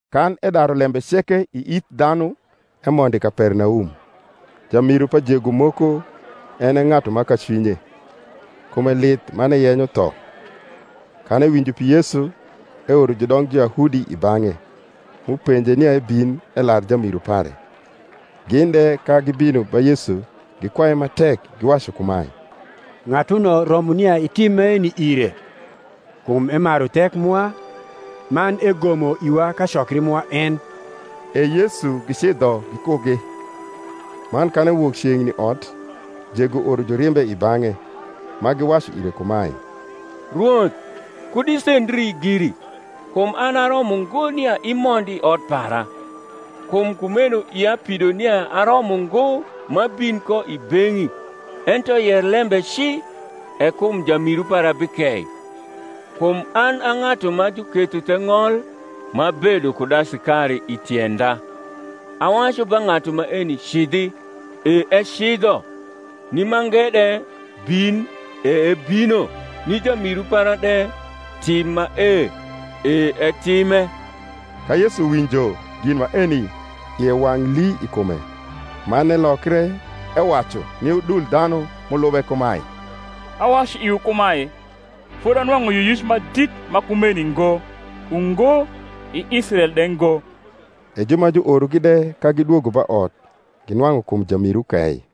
Kan edaru lembe ceke i ith dhanu, emondo i Kapernaum. Jamiru pa jego moko, en e ng’atu ma kacwinye, kume lith man eyenyo tho. Kan ewinjo pi Yesu, eoro judong Juyahudi i bang’e, m’upenje nia ebin elar jamiru pare. Gin de, ka gibino ba Yesu, gikwaye ma tek, giwacu kumae, Ng’atuno romo nia itim maeni ire; kum emaru thek mwa, man egomo iwa kacokri mwa en. E Yesu gicidho gikugi. Man kan ewok ceng’ni ot, jego oro jurimbe i bang’e, ma giwacu ire kumae, Rwoth, kud isendri giri; kum an aromo ngo nia imond i ot para: kum kumeno ia pido nia aromo ngo m’abin ko i beng’i: ento yer lembe ci, e kum jamiru para bikei. Kum an a ng’atu ma juketho the ng’ol, m’abedo kud asikari i tienda: awacu ba ng’atu maeni, Cidhi, e ecidho; ni mange de, Bin, e ebino; ni jamiru para de, Tim mae, e etime. Ka Yesu winjo gin maeni, ie wang’ lii i kume, man elokre ewacu ni udul dhanu m’ulube kumae, Awacu iwu kumae, Fodi anwang’u yioyic ma dit ma kumeni ngo, ungo, i Israel de ngo. E ju ma juorogi de, ka gidwogo ba ot, ginwang’u kum jamiru kei.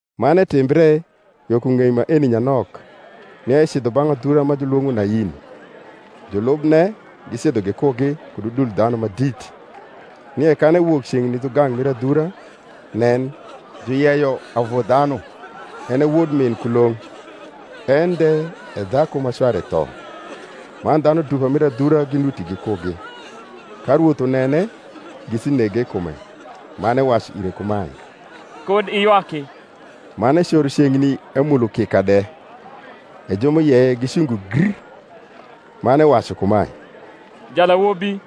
Man etimbre yo ku ng’ei maeni nyanok, nia ecidho bang’ adhura ma julwong’o Nain; julubne gicidho gikugi, kud udul dhanu ma dit. Nie kan ewok ceng’ni dhugang’ mir adhura, nen, juyeyo avu dhanu, en e wod min kulong’, en de e dhaku ma cware tho: man dhanu dupa mir adhura ginuti gikugi. Ka Rwoth unene, ngisi nege i kume, man ewacu ire kumae, Kud iywakr. Man ecoro ceng’ni emulo kika de: e ju m’uyeye gicungo gr. Man ewacu kumae, Jalawobi,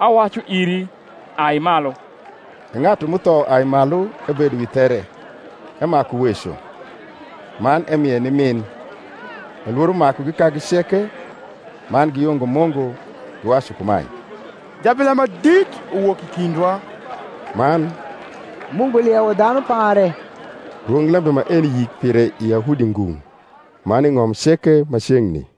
awacu iri, Ai malu. E ng’atu m’utho uai malu, ebedo wi there, emaku weco. Man emie ni min. Elworomakugi kagi ceke: man giyungo Mungu, giwacu kumae, Jabila ma dit uwok i kindwa: man, Mungu liewo dhanu pare. Rwonglembe maeni yik pire i Yahudi ngung’, man i ng’om ceke ma ceng’ni.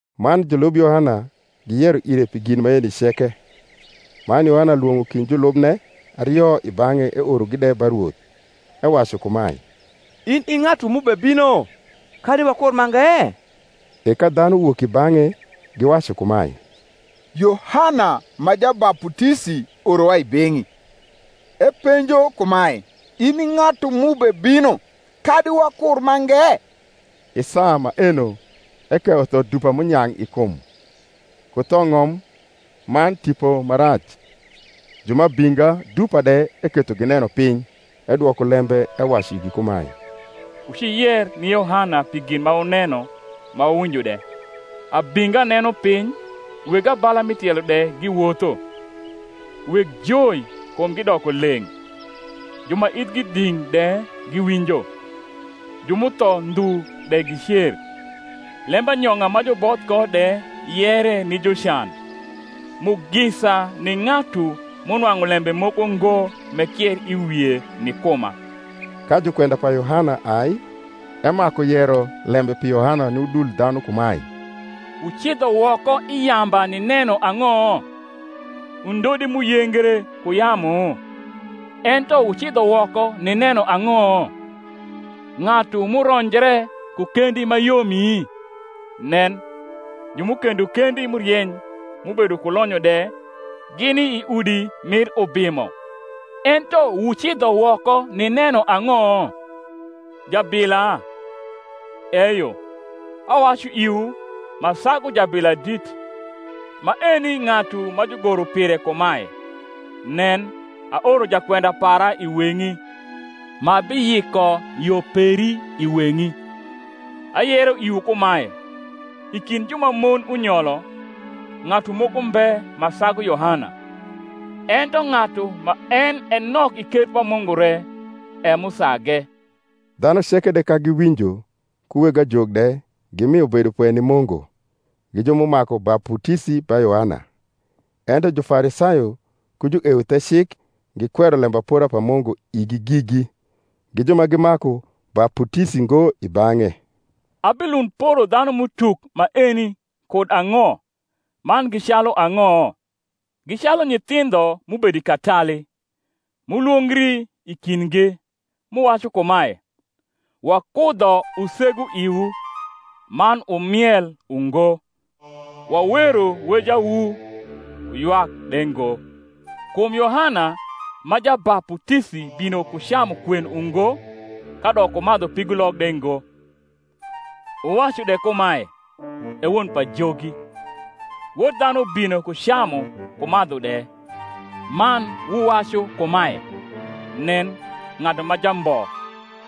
Man julub Yohana giyero ire pi gin maeni ceke. Man Yohana lwong’o kind julubne ario i bang’e eorogi de ba Rwoth, ewacu kumae, In i ng’atu m’ubebino, kadi wakur mange? E ka dhanu wok i bang’e, giwacu kumae, Yohana ma Jabaputisi orowa i beng’i, epenjo kumae, In i ng’atu m’ubebino, kadi wakur mange? I saa maeno ekeyo tho dupa m’unyang’ i kum, ku thong’om man tipo ma rac; ju ma abinga dupa de eketho gineno piny. Edwoko lembe ewacu igi kumae, Wuciyer ni Yohana pi gin ma wuneno ma wuwinjo de; abinga neno piny, weg abala mi tielo de giwotho, weg joi kumgi doko leng’, ju ma ithgi dhing’ de giwinjo, ju m’utho ndhu de gicer, lembanyong’a ma juboth ko de yere ni jucan. Mugisa ni ng’atu m’unwang’u lembe moko ngo m’ekier i wie ni kuma. Ka jukwenda pa Yohana ai, emaku yero lembe pi Yohana ni udul dhanu kumae, Wucidho woko i yamba nineno ang’o? undodi m’uyengre ku yamu? Ento wucidho woko nineno ang’o? ng’atu m’uronjre ku kendi ma yomi? Nen, ju m’ukendo kendi m’urieny, m’ubedo ku lonyo de, gini i udi mir ubimo. Ento wucidho woko nineno ang’o? jabila? Eyo, awacu iwu, ma sagu jabila dit. Maeni ng’atu ma jugoro pire kumae, Nen, aoro jakwenda para i weng’i, Ma biyiko yo peri i weng’i. Ayero iwu kumae, I kind ju ma mon unyolo, ng’atu moko mbe ma sagu Yohana: ento ng’atu ma en e nok i ker pa Mungu re e m’usage. Dhanu ceke de ka giwinjo, ku weg ajok de, gimio bedopwe ni Mungu, gi ju m’umaku baputisi ba Yohana. Ento Jufarisayo ku jueuthecik gikwero lembapora pa Mungu igi gigi, gi ju ma gimaku baputisi ngo i bang’e. Abilund poro dhanum’utuk maeni kud ang’o, man gi calu ang’o? Gi calu nyithindho m’ubedo i katali, m’ulwongri i kindgi; m’uwacu kumae, Wakudho usegu iwu, man wumiel ungo; wawero wejawu, wuywak de ngo. Kum Yohana ma Jabaputisi bino ku camu kwen ungo kadok ku madhu pigulok de ngo; wuwacu de kumae, E won pajogi. Wod dhanu bino ku camu ku madhu de: man wuwacu kumae, Nen, ng’atu ma jambo,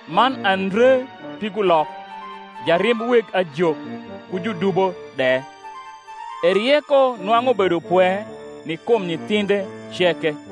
man andre pigulok, jarimb weg ajok ku judubo de! E rieko nwang’u bedopwe ni kum nyithindhe ceke.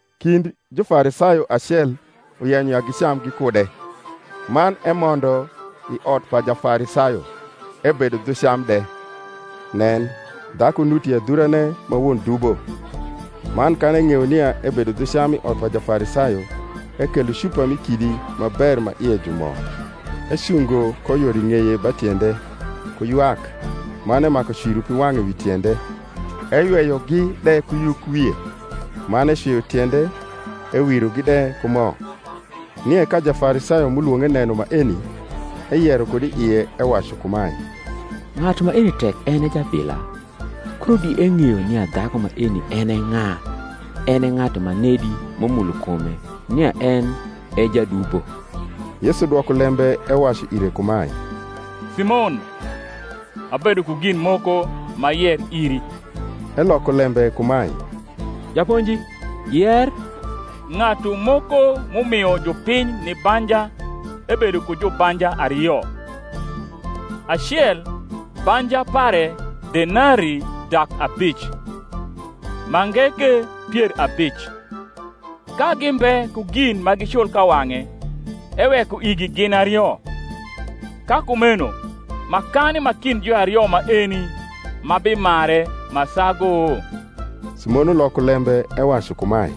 Kind Jufarisayo acel uyenyo ya gicam gikude. Man emondo i ot pa Jafarisayo, ebedo dhu cam de. Nen, dhaku nuti i adhurane ma won dubo; man kan eng’eyo nia ebedo dhu cam i ot pa Jafarisayo, ekelo cupa mi kidi ma ber ma ie ju mo, ecungo ko yor i ng’eye ba tiende, ku ywak, man emaku cwiro piwang’e wi tiende, eyweyogi de ku yukwie, man ecwio tiende, ewirogi de ku mo. Nie ka Jafarisayo m’ulwong’e neno maeni, eyero kud i ie, ewacu kumae, Ng’atu maeni, tek en e jabila, kuno di eng’eyo nia dhaku maeni en e ng’a en e ng’atu manedi m’umulo kume, nia en e jadubo. Yesu dwoko lembe ewacu ire kumae, Simon, abedo ku gin moko m’ayer iri. Eloko lembe kumae, Japonji, yer. Ng’atu moko m’umio jupiny ni banja ebedo ku jubanja ario: acel banja pare denarii dak abic, mange ke pier abic. Ka gimbe ku gin ma gicul ka wang’e, eweko igi gin ario. Ka kumeno makani ma kind juario maeni ma bimare ma sagu? Simon uloko lembe ewacu kumae,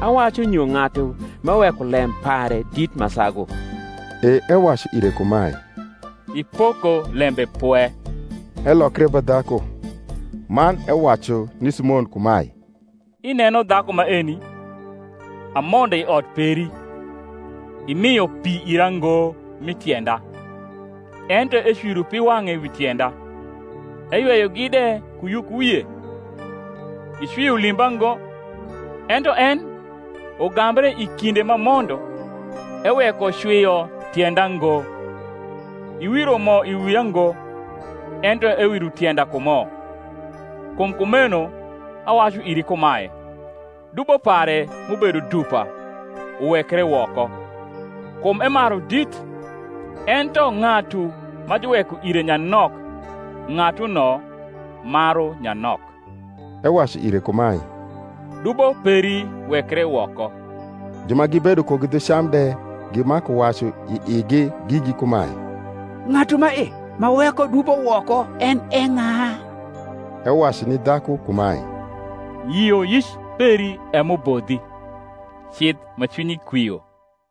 Awacu nyo ng’atu m’eweko lem pare dit ma sagu. E ewacu ire kumae, Ipoko lembe pwe. Elokre ba dhaku, man ewacu ni Simon kumae, Ineno dhaku maeni? Amondo i ot peri, imio pi ira ngo mi tienda: ento ecwiro piwang’e wi tienda, eyweyogi de ku yukwie. Icwio limba ngo: ento en, ugambre i kinde m’amondo, eweko cwio tienda ngo. Iwiro mo i wia ngo: ento ewiro tienda ku mo. Kum kumeno awacu iri kumae, Dubo pare, m’ubedo dupa, uwekre woko; kum emaru dit: ento ng’atu ma juweko ire nyanok, ng’atuno maru nyanok. Ewacu ire kumae, Dubo peri wekre woko. Ju ma gibedo kugi dhu cam de gimaku wacu i igi gigi kumae, Ng’atu mae ma weko dubo woko en e ng’a? Ewacu ni dhaku kumae, Yioyic peri e m’ubodhi; cidh ma cwinyi kwio.